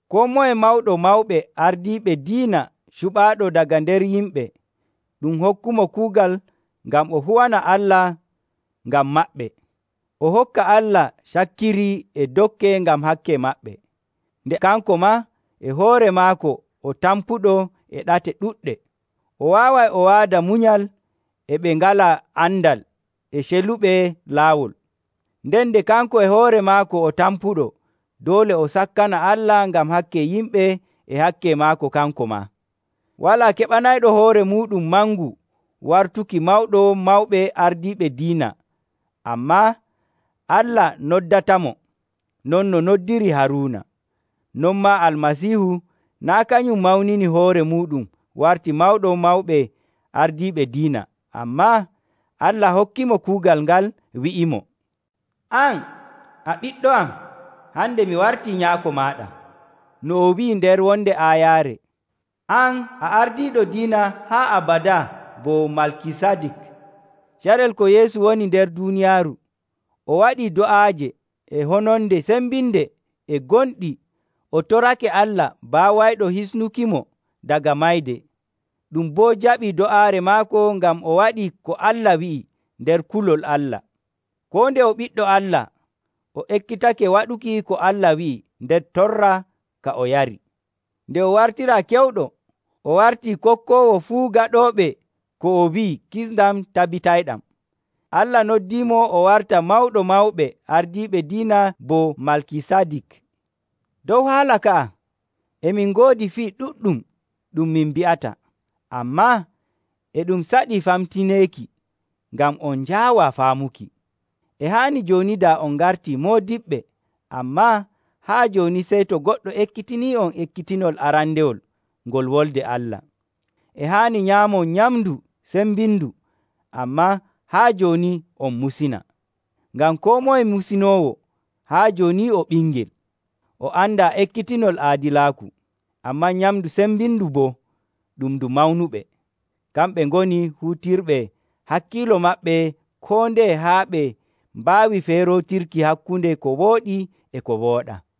Koo moye mawɗo mawɓe ardiiɓe diina cuɓaaɗo daga nder yimɓe, ɗum hokkumo kuugal ngam o huwana Allah ngam maɓɓe, o hokka Allah cakkiri e dokke ngam hakke maɓɓe. Nde kanko maa e hoore maako o tampuɗo e ɗate ɗuɗɗe, o waaway o waada munyal e ɓe ngalaa andal e celuɓe laawol. Nden nde kanko e hoore maako o tampuɗo, doole o sakkana Allah ngam hakke yimɓe e hakke maako, kanko maa. Walaa keɓanayɗo hoore muuɗum mangu wartuki mawɗo mawɓe ardiiɓe diina, ammaa Allah noddatamo, non no noddiri Haruuna. Non maa Almasiihu naa' kanum mawnini hoore muuɗum warti mawɗo mawɓe ardiiɓe diina, ammaa Allah hokkimo kuugal ngal, wi'imo, “An a Ɓiɗɗo am. Hande mi wartii Nyaako maaɗa.” No o wi'i nder wonde aayaare, “An a ardiiɗo diina haa abadaa bo Malkisadik.” Carel ko Yeesu woni nder duuniyaaru, o waɗii do'aaje e hononde cembinde e gonɗi o torake Allah baawayɗo hisnukimo daga mayde. Ɗum boo jaɓii do'aare maako ngam o waɗii ko Allah wi'i nder kulol Allah. Koo nde o Ɓiɗɗo Allah o ekkitake waɗuki ko Allah wi'i nder torra ka o yari. Nde o wartiraa kewɗo, o wartii kokkoowo fuu gaɗooɓe ko o wi'i kisndam tabitayɗam. Allah noddiimo o warta mawɗo mawɓe ardiiɓe diina bo Malkisadik. Dow haala ka'a e min ngoodi fii ɗuɗɗum ɗum min mbi'ata, ammaa e ɗum saɗi famtineeki ngam on njaawaa faamuki. E haani jooni daa on ngartii moodiɓɓe, ammaa haa jooni sey to goɗɗo ekkitinii'on ekkitinol arandewol ngol Wolde Allah. E haani nyaamon nyamndu cembindu, ammaa haa jooni on musina. Ngam koo moye musinoowo haa jooni o ɓingel, o andaa ekkitinol aadilaaku. Ammaa nyamndu cembindu boo, ɗum ndu mawnuɓe. Kamɓe ngoni huutirɓe hakkiilo maɓɓe koo ndeye haa e ɓe mbaawi feerootirki hakkunde ko wooɗi e ko wooɗaa.